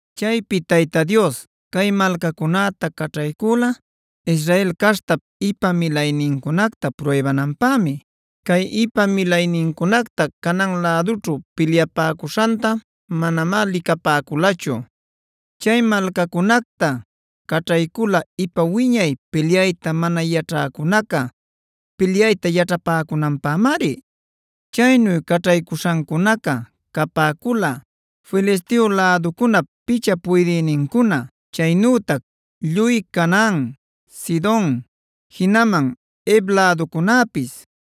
Chaypi Tayta Dios cay malcacunäta caćhaycula Israel caśhtap ipa milaynincunacta pruybananpämi. Cay ipa milaycunaca Canaan lädućhu pilyapäcuśhanta manamá licapäculachu. Chay malcacunacta caćhaycüla ipa wiñay pilyayta mana yaćhäcunaca, pilyayta yaćhapäcunanpämari. Chaynu caćhaycuśhancunaca capäcula: Filisteo läducunap picha puydïnincuna, chaynütac lluy Canaan, Sidon, jinaman Hev läducunäpis.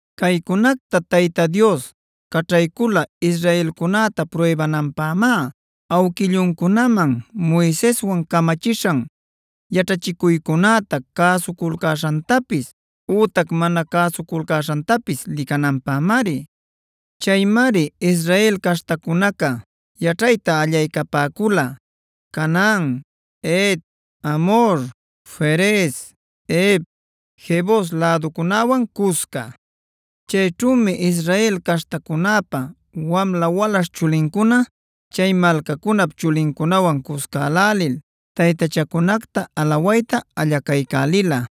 Caycunacta Tayta Dios caćhaycula israelcunäta pruybananpämá; awquilluncunaman Moiseswan camachishan yaćhachicuycunäta cäsuculcäśhantapis ütac mana cäsuculcaśhantapis licananpämari. Chaymari Israel caśhtacunaca yaćhayta allaycapäcula Canaan, Het, Amhor, Ferez, Hev, Jebus läducunäwan cusca. Chayćhümi Israel caśhtacunäpa wamla walaśh chulincuna chay malcacunap chulincunawan cuscälälil taytachancunacta alawayta allacaycälila.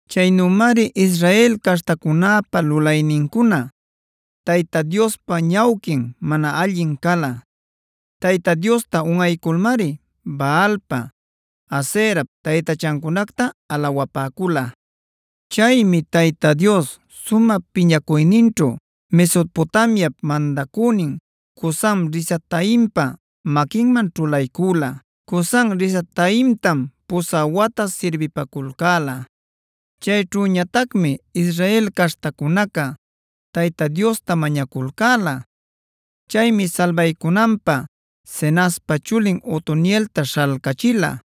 Chaynümari Israel caśhtacunäpa lulaynincuna Tayta Diospa ñawquin mana allin cala. Tayta Diosta unꞌayculmari Baalpa, Aserap taytachancunacta alawapäcula. Chaymi Tayta Dios sumä piñacuyninćhu Mesopotamiap mandacünin Cusan-risataimpa maquinman ćhulaycüla. Cusan-risataimtam pusä wata sirbipaculcäla. Chayćhüñatacmi Israel caśhtacunaca Tayta Diosta mañaculcäla. Chaymi salbaycunanpä Cenazpa chulin Otonielta śhalcachila.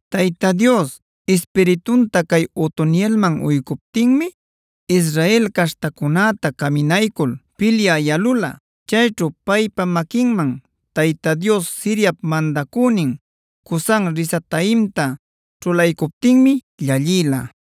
Tayta Dios Ispiritunta cay Otonielman uycuptinmi Israel caśhtacunäta caminaycul pilyä yalula. Chayćhu paypa maquinman Tayta Dios Siriap mandacünin Cusan-risataimta ćhulaycuptinmi llallïla.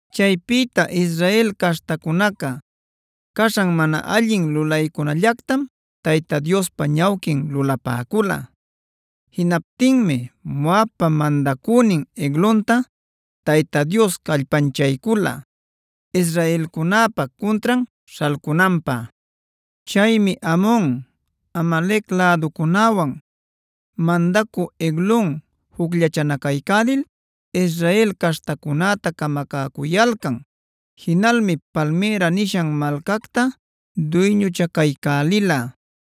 Chaypïta Israel caśhtacunaca caśhan mana allin lulaycunallactam Tayta Diospa ñawquin lulapäcula. Jinaptinmi Moabpa mandacünin Eglonta Tayta Dios callpanchaycula israelcunäpä cuntran śhalcunanpä. Chaymi Amon, Amalec läducunäwan, mandacü Eglon jucllachanacaycälil Israel caśhtacunäta camacäcuyalcan. Jinalmi Palmïra nishan malcacta duyñuchacaycälila.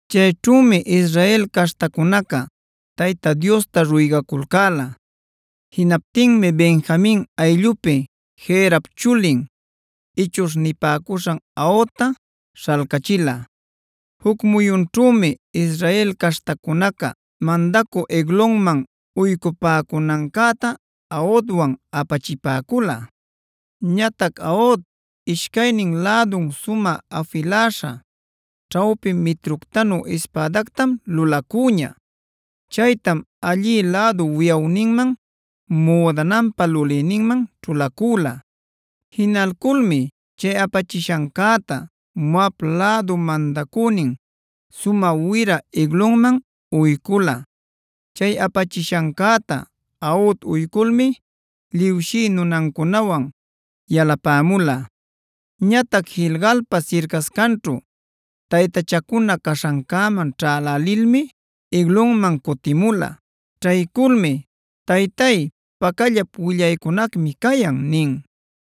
Chayćhümi Israel caśhtacunaca Tayta Diosta ruygaculcäla. Jinaptinmi Benjamin ayllupi Gerap chulin, ichuśh nipäcuśhan Aodta śhalcachila. Juc muyunćhümi Israel caśhtacunaca mandacü Eglonman uycupäcunancäta Aodwan apachipäcula. Ñatac Aod ishcaynin lädun sumä afiläśha, ćhawpi mitructanu ispädactam lulacüña. Chaytam allï lädu wiyawninman, müdananpa lulïninman ćhulacüla. Jinalculmi chay apachishancäta Moab lädup mandacünin sumä wira Eglonman uycula. Chay apachishancäta Aod uyculmi liwshï nunacunäwan yalapämula. Ñatac Gilgalpa sircascanćhu taytachacuna caśhancäman ćhälälilmi Eglonman cutimula. Ćhayculmi: “Taytay, pacallap willaycunacmi cayan” nin.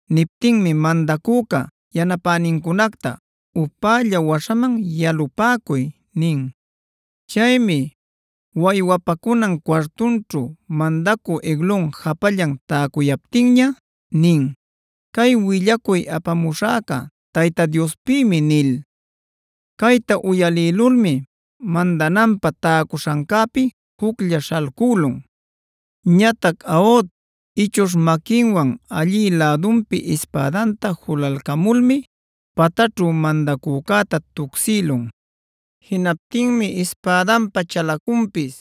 Niptinmi mandacüca yanapänincunacta: “Upälla waśhaman yalupäcuy” nin. Chaymi waywapacunan cuartunćhu mandacü Eglon japallan täcuyaptinña nin: “Cay willacuy apamuśhäca Tayta Diospïmi” nil. Cayta uyalïlulmi mandananpä täcuśhancäpi juclla śhalcülun. Ñatac Aod ichuśh maquinwan allï lädunpi ispädanta julalcamulmi pataćhu mandacücäta tucsïlun. Jinaptinmi ispädanpä chalacunpis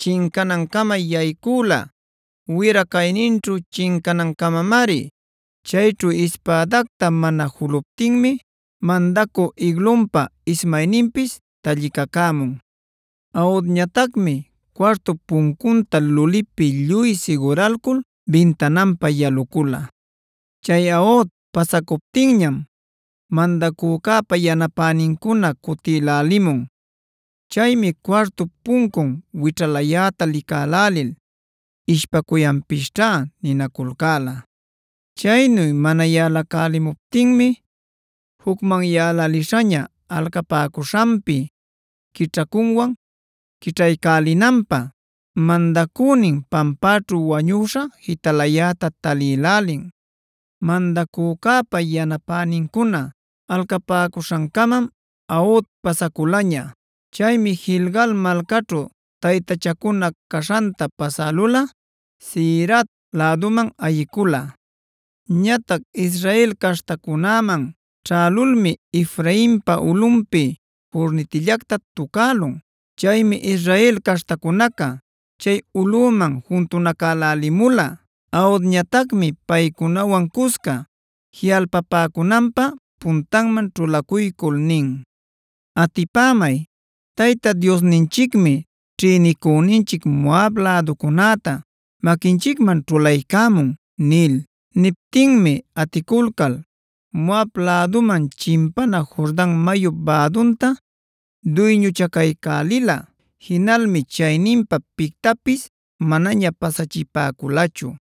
chincanancama yaycüla, wira cayninćhu chincanancamamari. Chayćhu ispädacta mana juluptinmi mandacü Eglonpa ismayninpis tallicacämun. Aodñatacmi cuartup puncunta lulipi lluy siguralcul bintananpa yalucula. Chay Aod pasacuptinñam mandacücäpa yanapänincuna cutïlälimun. Chaymi cuartup puncun wićhalayäta licälälil “ishpacuyanpisćhä” ninaculcäla. Chaynu mana yalacälimuptinmi jucmanyäläliśhaña alcapäcuśhanpi quićhacunwan quićhaycälinanpä mandacünin pampäćhu wañüśha jitalayäta talïlälin. Mandacücäpa yanapänincuna alcapäcuśhancamam Aod pasaculaña. Chaymi Gilgal malcaćhu taytachacuna caśhanta pasälulꞌa Seirat läduman ayicula. Ñatac Israel caśhancunäman ćhälulmi Efrainpa ulꞌunpi curnitillacta tucälun. Chaymi Israel caśhtacunaca chay ulꞌüman juntunacälälimula. Aodñatacmi paycunawan cusca jiꞌalpapäcunanpä puntanman ćhulacuycul nin: “Atipämay, Tayta Diosninchicmi ćhïnicüninchic Moab läducunäta maquinchicman ćhulaycämun” nil. Niptinmi aticulcal Moab läduman chimpana Jordan mayup bädunta duyñuchacaycälila. Jinalmi chayninpa pictapis manaña pasachipäculachu.